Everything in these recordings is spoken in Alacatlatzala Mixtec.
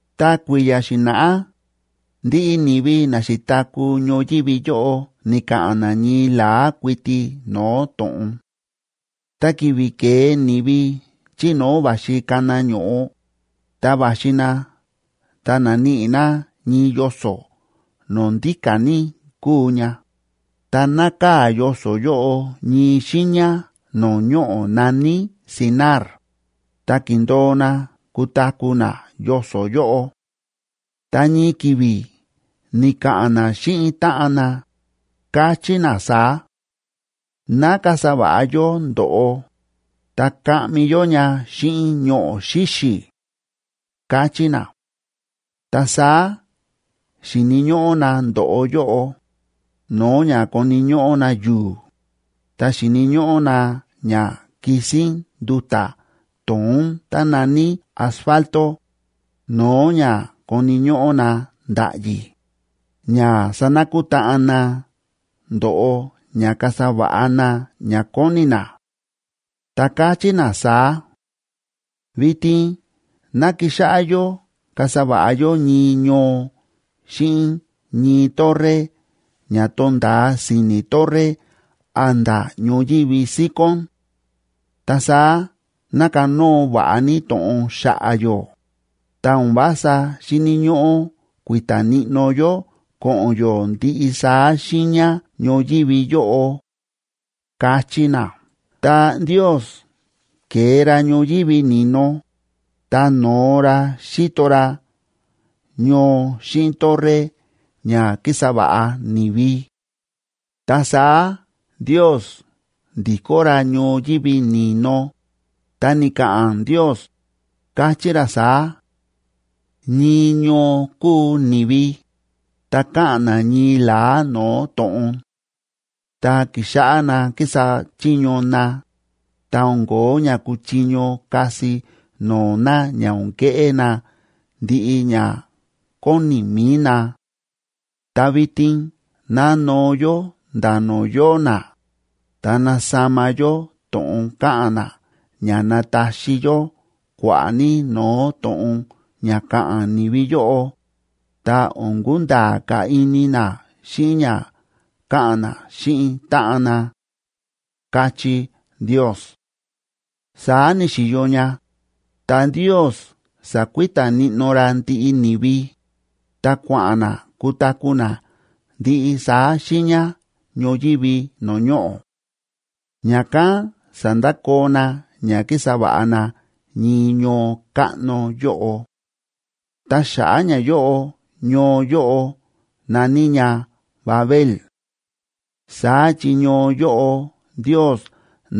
Ta kui̱ya̱ xi̱na̱ꞌá, ndiꞌi ni̱vi na xi̱taku̱ ñoyívi yóꞌo ni̱ka̱ꞌa̱n na ñii la̱á kuiti no̱o̱ to̱ꞌon. Ta ki̱vi̱ ke̱e ni̱vi chí no̱o̱ va̱xi kana ño̱ꞌo, ta va̱xi na ta na̱níꞌi na ñii yoso̱ no̱o̱ ndíka̱ ní kúu ña, ta nákaa̱ yoso̱ yóꞌo ñii xiiña no̱o̱ ñoꞌo̱ na̱ní Sinar,a ta ki̱ndo̱o na kutaku̱ na yoso̱ yóꞌo. Ta ñii ki̱vi̱ ni̱ka̱ꞌa̱n na xíꞌin táꞌan na, káchí na saá: ―Ná kasa va̱ꞌa yó ndo̱ꞌo, ta kaꞌmi yó ña xíꞌin ñoꞌo̱ xíxi̱ ―káchí na. Ta saá xi̱ni̱ ñóꞌó na ndo̱ꞌo yóꞌo, no̱o̱ ña koni̱ ñóꞌó na yu̱u̱, ta xi̱ni̱ ñóꞌó na ña kisín nduta̱ to̱ón tá na̱ní asfalto, no̱o̱ ña koni̱ ñóꞌó na nda̱ꞌyi̱, ña sanakutáꞌan na ndo̱ꞌo ña kasa va̱ꞌa na ña kóni na. Ta káchí na saá: ―Vitin ná kixáꞌá yó kasa va̱ꞌa yó ñii ñoo xíꞌin ñii torre ña to̱nda̱a si̱ni̱ torre a̱nda̱ ñoyívi síkón. Ta saá ná kanóo va̱ꞌa ní to̱ꞌon xa̱ꞌa̱ yó, ta o̱n vása xíni̱ ñóꞌó kui̱ta̱ níꞌnó yó ko̱ꞌo̱n yó ndiꞌi saá xiiña ñoyívi yóꞌo ―káchí na. Ta Ndiosb ke̱e ra ñoyívi ni̱no, ta no̱o ra xíto ra ñoo xíꞌin torre ña kísa va̱ꞌa ni̱vi. Ta saá Ndios ndi̱kó ra ñoyívi ni̱no, ta ni̱ka̱ꞌa̱n Ndios, káchí ra saá: “Ñii ñoo kúu ni̱vi, ta káꞌa̱n na ñii la̱á no̱o̱ to̱ꞌon. Ta ki̱xáꞌá na kísa chiño na, ta o̱n ko̱ó ña kuchiño kasi no̱o̱ na ña o̱n keꞌé na ndiꞌi ña kóni mi̱i na. Ta vitin ná noo yó nda̱ no̱o̱ yóo na, ta nasama yó to̱ꞌon káꞌa̱n na ña nataxi yó kua̱ꞌa̱ ní no̱o̱ to̱ꞌon ña ka̱ꞌa̱n ni̱vi yóꞌo, ta o̱n kunda̱a̱ ka̱ ini na xíꞌin ña káꞌa̱n na xíꞌin táꞌan na”, káchí Ndios. Saá ni̱xi̱yo ña, ta Ndios sa̱kui̱ta̱ níꞌnó ra ndiꞌi ni̱vi, ta kua̱ꞌa̱n na kutaku̱ na ndiꞌi saá xiiña ñoyívi no̱o̱ ñoꞌo̱. Ña̱kán sa̱ndakoo na ña kísa va̱ꞌa na ñii ñoo káꞌno yóꞌo. Ta xa̱ꞌa̱ ñayóꞌo ñoo yóꞌo na̱ní ña Babel.c Saá chi ñoo yóꞌo Ndios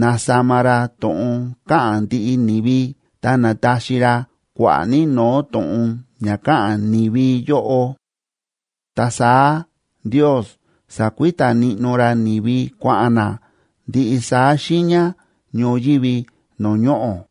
na̱sama ra to̱ꞌon káꞌa̱n ndiꞌi ni̱vi ta na̱taxi ra kua̱ꞌa̱ ní no̱o̱ to̱ꞌon ña ka̱ꞌa̱n ni̱vi yóꞌo. Ta saá Ndios sa̱kui̱ta̱ níꞌnó ra ni̱vi kua̱ꞌa̱n na ndiꞌi saá xiiña ñoyívi no̱o̱ ñoꞌo̱.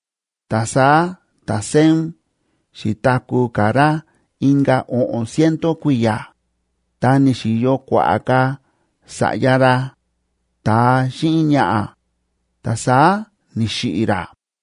Ta saá ta̱Sem xi̱taku̱ ka̱ ra inka̱ o̱ꞌo̱n ciento kui̱ya̱, ta ni̱xi̱yo kua̱ꞌa̱ ka̱ sa̱ꞌya ra, ta̱a xíꞌin ñaꞌa̱, ta saá ni̱xiꞌi̱ ra.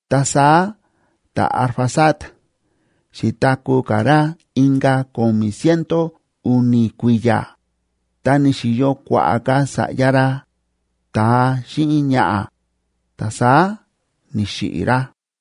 Ta saá ta̱Arfaxad xi̱taku̱ ka̱ ra inka̱ ko̱mi̱ ciento u̱ni̱ kui̱ya̱, ta ni̱xi̱yo kua̱ꞌa̱ ka̱ sa̱ꞌya ra, ta̱a xíꞌin ñaꞌa̱, ta saá ni̱xiꞌi̱ ra.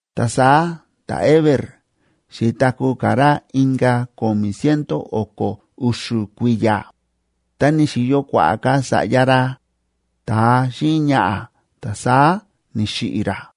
Ta saá ta̱Heber xi̱taku̱ ka̱ ra inka̱ ko̱mi̱ ciento o̱ko̱ u̱xu̱ kui̱ya̱, ta ni̱xi̱yo kua̱ꞌa̱ ka̱ sa̱ꞌya ra, ta̱a xíꞌin ñaꞌa̱, ta saá ni̱xiꞌi̱ ra.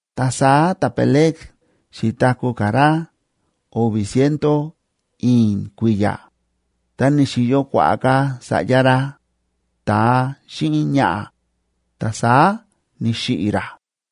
Ta saá ta̱Peleg xi̱taku̱ ka̱ ra o̱vi̱ ciento i̱i̱n kui̱ya̱, ta ni̱xi̱yo kua̱ꞌa̱ ka̱ sa̱ꞌya ra, ta̱a xíꞌin ñaꞌa̱, ta saá ni̱xiꞌi̱ ra.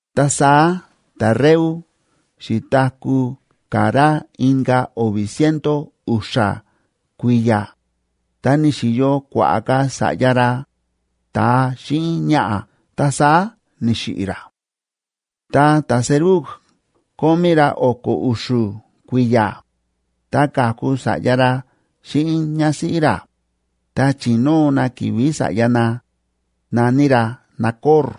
Ta saá ta̱Reu xi̱taku̱ ka̱ ra inka̱ o̱vi̱ ciento u̱xa̱ kui̱ya̱, ta ni̱xi̱yo kua̱ꞌa̱ ka̱ sa̱ꞌya ra, ta̱a xíꞌin ñaꞌa̱, ta saá ni̱xiꞌi̱ ra. Ta ta̱Serug kómí ra o̱ko̱ u̱xu̱ kui̱ya̱, ta ka̱ku sa̱ꞌya ra xíꞌin ñásíꞌí ra, ta chi̱nóo na ki̱vi̱ sa̱ꞌya na, na̱ní ra Nacor.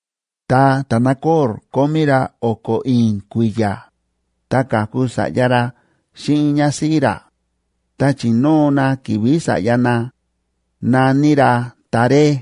Ta ta̱Nacor kómí ra o̱ko̱ i̱i̱n kui̱ya̱, ta ka̱ku sa̱ꞌya ra xíꞌin ñásíꞌí ra, ta chi̱nóo na ki̱vi̱ sa̱ꞌya na, na̱ní ra Taré.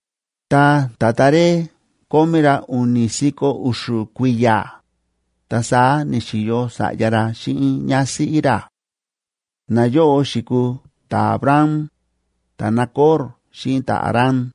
Ta ta̱Taré kómí ra u̱ni̱ si̱ko̱ u̱xu̱ kui̱ya̱, ta saá ni̱xi̱yo sa̱ꞌya ra xíꞌin ñásíꞌí ra; nayóꞌo xi̱kuu ta̱Abram, ta̱Nacor xíꞌin ta̱Harán.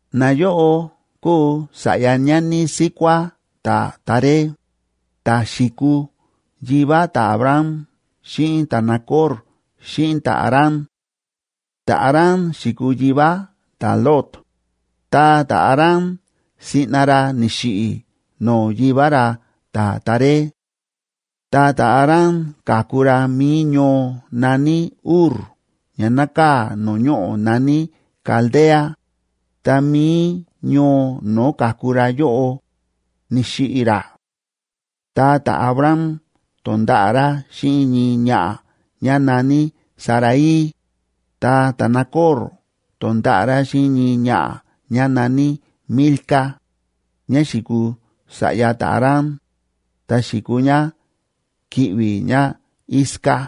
Nayóꞌo kúu sa̱ꞌya ñani síkuá ta̱Taré, ta̱ xi̱kuu yivá ta̱Abram xíꞌin ta̱Nacor xíꞌin ta̱Harán. Ta̱Harán xi̱kuu yivá ta̱Lot, ta ta̱Harán siꞌna ra ni̱xiꞌi̱ no̱o̱ yivá ra ta̱Taré. Ta ta̱Harán ka̱ku ra mi̱i ñoo na̱ní Ur ña nákaa̱ no̱o̱ ñoꞌo̱ na̱ní Caldea, ta mi̱i ñoo no̱o̱ ka̱ku ra yóꞌo, ni̱xiꞌi̱ ra. Ta ta̱Abram to̱nda̱ꞌa̱ ra xíꞌin ñii ñaꞌa̱ ñá na̱ní Sarai, ta ta̱Nacor to̱nda̱ꞌa̱ ra xíꞌin ñii ñaꞌa̱ ñá na̱ní Milca, ñá xi̱kuu sa̱ꞌya ta̱Harán, ta xi̱kuu ñá ki̱ꞌvi̱ ñáIsca.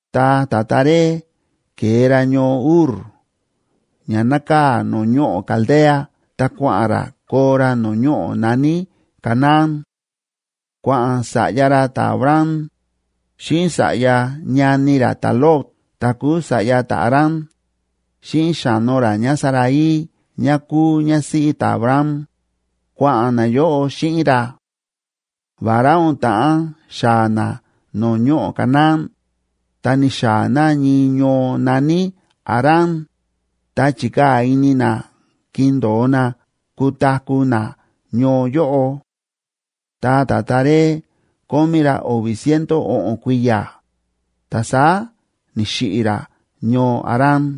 Ta ta̱Taré ke̱e ra ñoo Ur ña nákaa̱ no̱o̱ ñoꞌo̱ Caldea ta kua̱ꞌa̱n ra koo ra no̱o̱ ñoꞌo̱ na̱ní Canaán. Kua̱ꞌa̱n sa̱ꞌya ra ta̱Abram, xíꞌin sa̱ꞌya ñani ra ta̱Lot ta̱ kúu sa̱ꞌya ta̱Harán, xíꞌin xa̱no ra ñáSarai ñá kúu ñásíꞌí ta̱Abram, kua̱ꞌa̱n nayóꞌo xíꞌin ra. Vará o̱n ta̱ꞌán xaa̱ na no̱o̱ ñoꞌo̱ Canaán, ta ni̱xaa̱ na ñii ñoo na̱ní Harán, ta chi̱kaa̱ ini na kindo̱o na kutaku̱ na ñoo yóꞌo. Ta ta̱Taré kómí ra o̱vi̱ ciento o̱ꞌo̱n kui̱ya̱, ta saá ni̱xiꞌi̱ ra ñoo Harán.